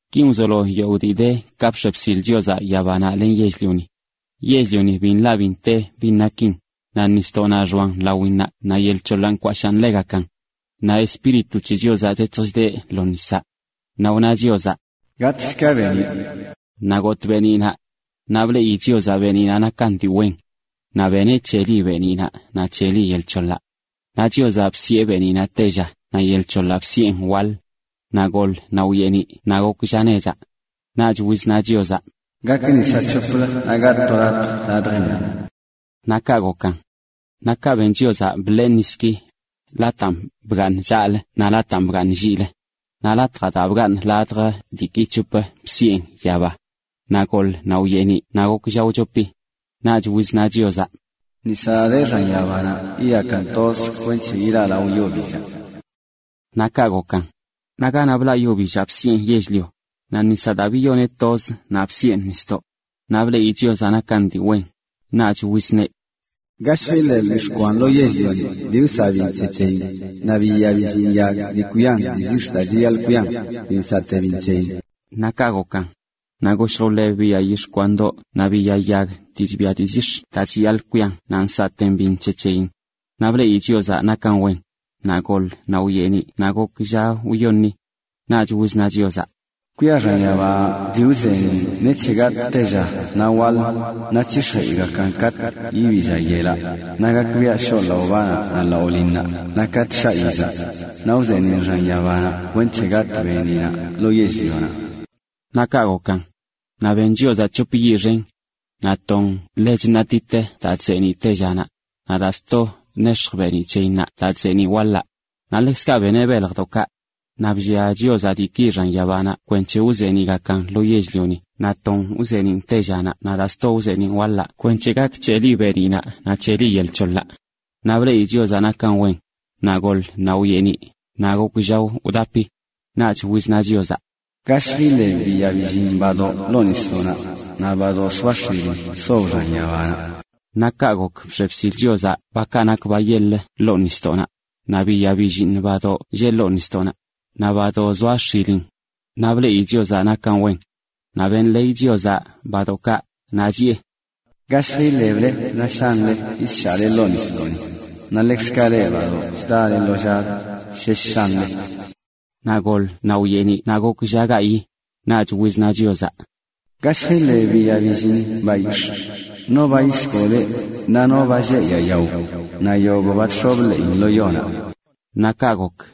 Kin wzolo yogꞌ dii de ka bx̱e bsil Chiozaꞌ yabanaꞌ len yell-lioni. Yell-lioni bi nḻaꞌ bi nte bin nakin, naꞌ nisdoꞌnaꞌ xoan lawinnaꞌ naꞌ yel c̱hoḻaꞌ nkwashaan ḻegakan. Naꞌ Espíritu c̱he Chiozaꞌ chec̱hj chdeꞌ lo nisaꞌ. Naꞌ wna Chiozaꞌ: “Gatꞌshka beeniꞌ.” Naꞌ gotꞌ beeniꞌnaꞌ. Naꞌ bleꞌi Chiozaꞌ beeniꞌnaꞌ nakan dii wen. Naꞌ beneꞌ c̱heli beeniꞌnaꞌ naꞌ c̱heli yel c̱hoḻaꞌ. Naꞌ Chiozaꞌ bsiꞌe beeniꞌnaꞌ “tella” naꞌ yel c̱hoḻaꞌ bsiꞌen “waḻ”. Naꞌ goḻ naꞌ wyeeniꞌ naꞌ gok lla nechaꞌ. Naꞌch wizna Chiozaꞌ: “Gak nisaꞌ c̱hoplə naꞌ gatꞌ to latj ladjinnaꞌ.” Naꞌ kaꞌ gokan. Naꞌ kaꞌ ben Chiozaꞌ bḻee niski, lataan bgaaṉan chaꞌlə naꞌ lataan bgaaṉan lliꞌlə. Naꞌ latjaꞌ daa bgaaṉ ladj diiki c̱hop bsiꞌen “yaba”. Naꞌ goḻ naꞌ wyeeniꞌ naꞌ gok lla wchopi. Naꞌch wizna Chiozaꞌ: “Nisaꞌ daa de xan yabanaꞌ yiyakan toz kwenc̱he ilaꞌlao yo billaꞌ.” Naꞌ kaꞌ gokan. Naꞌ ganaꞌ blaꞌ yo billaꞌ bsiꞌen “yell-lio”, naꞌ nisaꞌ daa biyoneꞌ toz naꞌ bsiꞌen “nisdoꞌ”. Naꞌ bleꞌi Chiozaꞌ nakan dii wen. Naꞌch wizneꞌ: “Gashj iḻeb yix̱ꞌ kwan lo yell-lioni dii nsaꞌ biṉ c̱he c̱heyin, naꞌ biya billiiṉ yag dii kwian dii zix̱ daa chiyaḻꞌ kwian dii nsaꞌte biṉ c̱heyin.” Naꞌ kaꞌ gokan. Naꞌ goshj wḻeb biya yix̱ꞌ kwandoꞌ naꞌ biya yag dii chbia dii zix̱ daa chiyaḻꞌ kwian naꞌ nsaꞌte biṉ c̱he c̱heyin. Naꞌ bleꞌi Chiozaꞌ nakan wen. Naꞌ goḻ naꞌ wyeeniꞌ naꞌ gok lla wyoṉi. Naꞌch wizna Chiozaꞌ: “Kwia xan yabanaꞌ dii wzeeniꞌn nec̱he gatꞌ tella naꞌ waḻ, naꞌ c̱hix̱jeꞌgakan katꞌ yibii lla yelaꞌ, naꞌ gakbiaꞌ shoꞌ laꞌo banaꞌ naꞌ laꞌo linnaꞌ, naꞌ katꞌ shaꞌ yizaꞌ. Naꞌ wzeeniꞌn xan yabanaꞌ kwenc̱he gatꞌ beeniꞌnaꞌ lo yell-lionaꞌ.” Naꞌ kaꞌ gokan. Naꞌ ben Chiozaꞌ c̱hop yiꞌ xen: naꞌ ton ḻe chṉaꞌtit daa chzeeniꞌ tellánaꞌ, naꞌ daa sto nex̱jch beeniꞌ c̱heyinnaꞌ daa chzeeniꞌ waḻaꞌ. Naꞌ ḻekzkaꞌ beneꞌ beljdoꞌkaꞌ. Naꞌ bllia Chiozaꞌ diiki xan yabanaꞌ kwenc̱he wzeeniꞌgakan lo yell-lioni naꞌ ton wzeeniꞌn tellánaꞌ naꞌ daa sto wzeeniꞌn waḻaꞌ kwenc̱he gak c̱heli beeniꞌnaꞌ naꞌ c̱heli yel c̱hoḻaꞌ. Naꞌ bleꞌi Chiozaꞌ nakan wen. Naꞌ goḻ naꞌ wyeeniꞌ, naꞌ gok lla wdapi. Naꞌch wizna Chiozaꞌ: “Gashj iḻeb biya billiiṉ badoꞌ ḻoo nisdoꞌnaꞌ, naꞌ badoꞌ zoa x̱ilin sob xan yabanaꞌ.” Naꞌ kaꞌ gok bx̱e bsileꞌ bakaꞌ nak ba yeḻ wal ḻoo nisdoꞌnaꞌ, naꞌ biya billiiṉ badoꞌ lleꞌ ḻoo nisdoꞌnaꞌ, naꞌ badoꞌ zoa x̱ilin. Naꞌ bleꞌi Chiozaꞌ nakan wen, naꞌ benḻeey Chiozaꞌ badoꞌkaꞌ, chiꞌe: “Gashj iḻeble naꞌ shanle naꞌ yisshaꞌle ḻoo nisdoꞌni. Naꞌ ḻekzkaꞌ leꞌ, badoꞌ chda lo llazə, shesh shanle.” Naꞌ goḻ naꞌ wyeeniꞌ naꞌ gok lla gayiꞌ. Naꞌch wizna Chiozaꞌ: “Gashj iḻeb biya billiiṉ bayix̱ꞌ: no ba yisgoleꞌ, naꞌ ba sheꞌ yaa yao, naꞌ yogꞌ ba wx̱ob ḻeeyin lo yonaꞌ.” Naꞌ kaꞌ gok.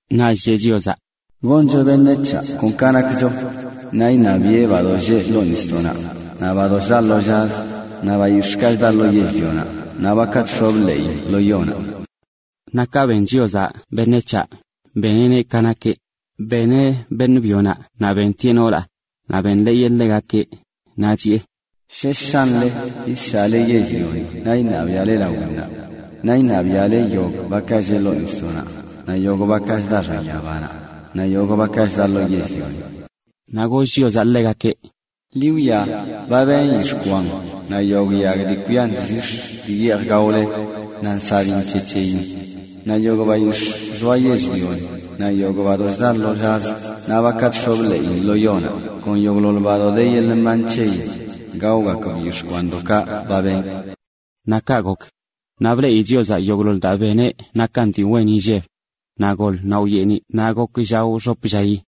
Naꞌch chiꞌe: “Goncho beṉec̱haꞌ kon ka nakcho. Naꞌ iṉabiꞌe bakaꞌ lleꞌ ḻoo nisdoꞌnaꞌ, naꞌ bakaꞌ chda lo llazə, naꞌ bayix̱ꞌkaꞌ chda lo yell-lionaꞌ, naꞌ bakaꞌ chx̱ob ḻeeyin lo yonaꞌ.” Naꞌ ka ben Chiozaꞌ beṉec̱haꞌ, beneꞌneꞌ ka nakeꞌ; beneꞌ beṉꞌ byonaꞌ naꞌ bentieꞌ noolaꞌ. Naꞌ benḻeeyeꞌ ḻegakeꞌ, chiꞌe: “Shesh shanle yisshaꞌle yell-lioni naꞌ iṉabiaꞌle lawinnaꞌ. Naꞌ iṉabiaꞌle yogꞌ bakaꞌ lleꞌ ḻoo nisdoꞌnaꞌ, naꞌ yogꞌ bakaꞌ chda x̱an yabanaꞌ, naꞌ yogꞌ bakaꞌ chda lo yell-lioni.” Naꞌ goll Chiozaꞌ ḻegakeꞌ: “Ḻi wwia, ba beṉꞌ yix̱ꞌ kwan naꞌ yogꞌ yag dii kwian dii zix̱ dii yeej gaole, naꞌ nsaꞌ biṉ c̱he c̱heyin. Naꞌ yogꞌ bayix̱ꞌ zoa yell-lioni, naꞌ yogꞌ badoꞌ chda lo llazə, naꞌ bakaꞌ chx̱ob ḻeeyin lo yonaꞌ, kon yogꞌḻoḻ ba de yeḻꞌ mban c̱heyin, gaogakb yix̱ꞌ kwandoꞌkaꞌ ba benꞌ.” Naꞌ kaꞌ gok. Naꞌ bleꞌi Chiozaꞌ yogꞌḻoḻ daa ba beneꞌ nakan dii wen inlleb. Naꞌ goḻ naꞌ wyeeniꞌ naꞌ gok lla wxop llayi.